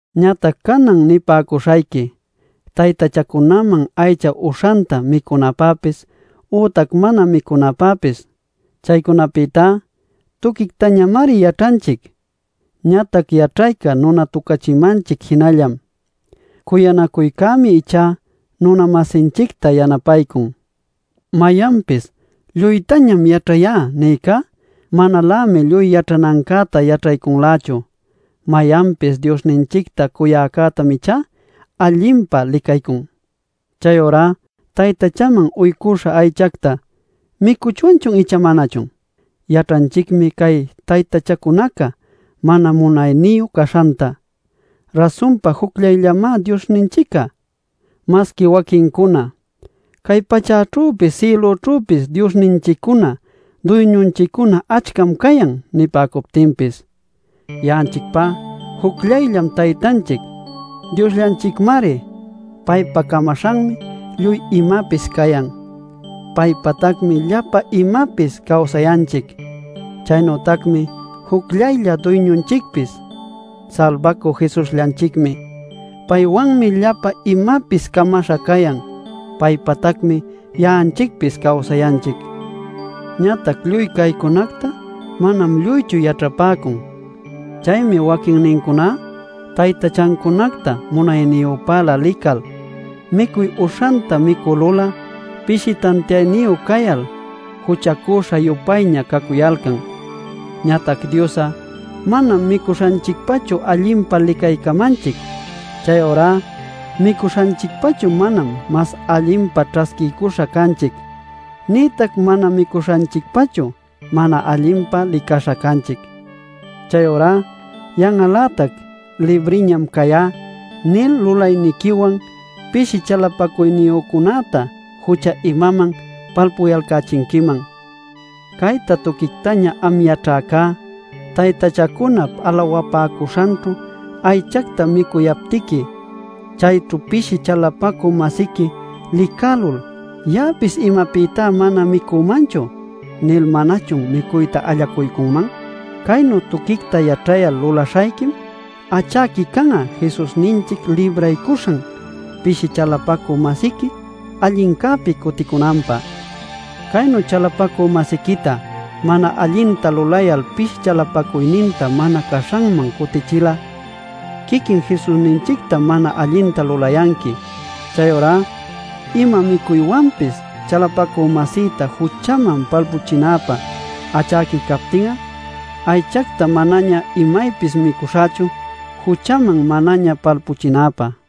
Ñatac canan nipäcuśhayqui taytachacunaman aycha uśhanta micunapäpis ütac mana micunapäpis. Chaycunapïtá tuquictañamari yaćhanchic. Ñatac yaćhayca nunatucachimanchic jinallam. Cuyanacuycämi ichá nuna-masinchicta yanapaycun. Mayanpis “Lluytañam yaćhayá” nïcá, manalämi lluy yaćhanancäta yaćhaycunlächu. Mayanpis Diosninchicta cuyäcätam ichá allinpa licaycun. Chayurá taytachaman uycuśha aychacta ¿micuchwanchun icha manachun? Yaćhanchicmi cay taytachacunaca mana munayniyu caśhanta. Rasunpa jucllayllamá Diosninchic'a. Masqui waquincuna: “Cay pachäćhüpis sïlućhüpis diosninchiccuna duyñunchiccuna achcam cayan” nipäcuptinpis, ya'anchicpá jucllayllam Taytanchic, Diosllanchicmari. Paypa camaśhanmi lluy imapis cayan. Paypätacmi llapa imapis cawsayanchic. Chaynütacmi jucllaylla Duyñunchicpis, Salbacü Jesusllanchicmi. Paywanmi llapa imapis camaśha cayan. Paypatacmi ya'anchicpis cawsayanchic. Ñatac lluy caycunacta manam lluychu yaćhapäcun. Chaymi waquinnincuná taytachancunacta munayniyüpälä lical, micuy uśhanta micülul'a pishi tantiayniyu cayal juchacüśha-yupayña cacuyalcan. Ñatac Dios'a manam micuśhanchicpachu allinpa licaycamanchic. Chayurá micuśhanchicpachu manam mas allinpa ćhasquiycuśha canchic nïtac mana micuśhanchicpachu mana allinpa licaśha canchic. Chayurá yan'al-lätac “Libriñam cayá” nil lulayniquiwan pishi chalapacuyniyücunäta jucha imaman palpuyalcächinquiman. Cayta tuquictaña am yaćhäca, taytachacunap alawapäcuśhanćhu aychacta micuyaptiqui chayćhu pishi chalapacü-masiqui licälul “¿Ya'apis imapïta mana micümanchu?” nil ¿manachun micuyta allacuycunman? Caynu tuquicta yaćhayal lulaśhayquim achäqui can'a Jesusninchic libraycuśhan pishi chalapacü-masiqui allincäpi cuticunanpä. Caynu chalapacü-masiquita mana allinta lulayal pishi chalapacuyninta mana caśhanman cutiyächil'a quiquin Jesusninchictam mana allinta lulayanqui. Chayurá ima micuywanpis chalapacü-masïta juchaman palpuchinanpä achäqui captin'a aychacta manaña imaypis micuśhächu, juchaman manaña palpuchinäpä.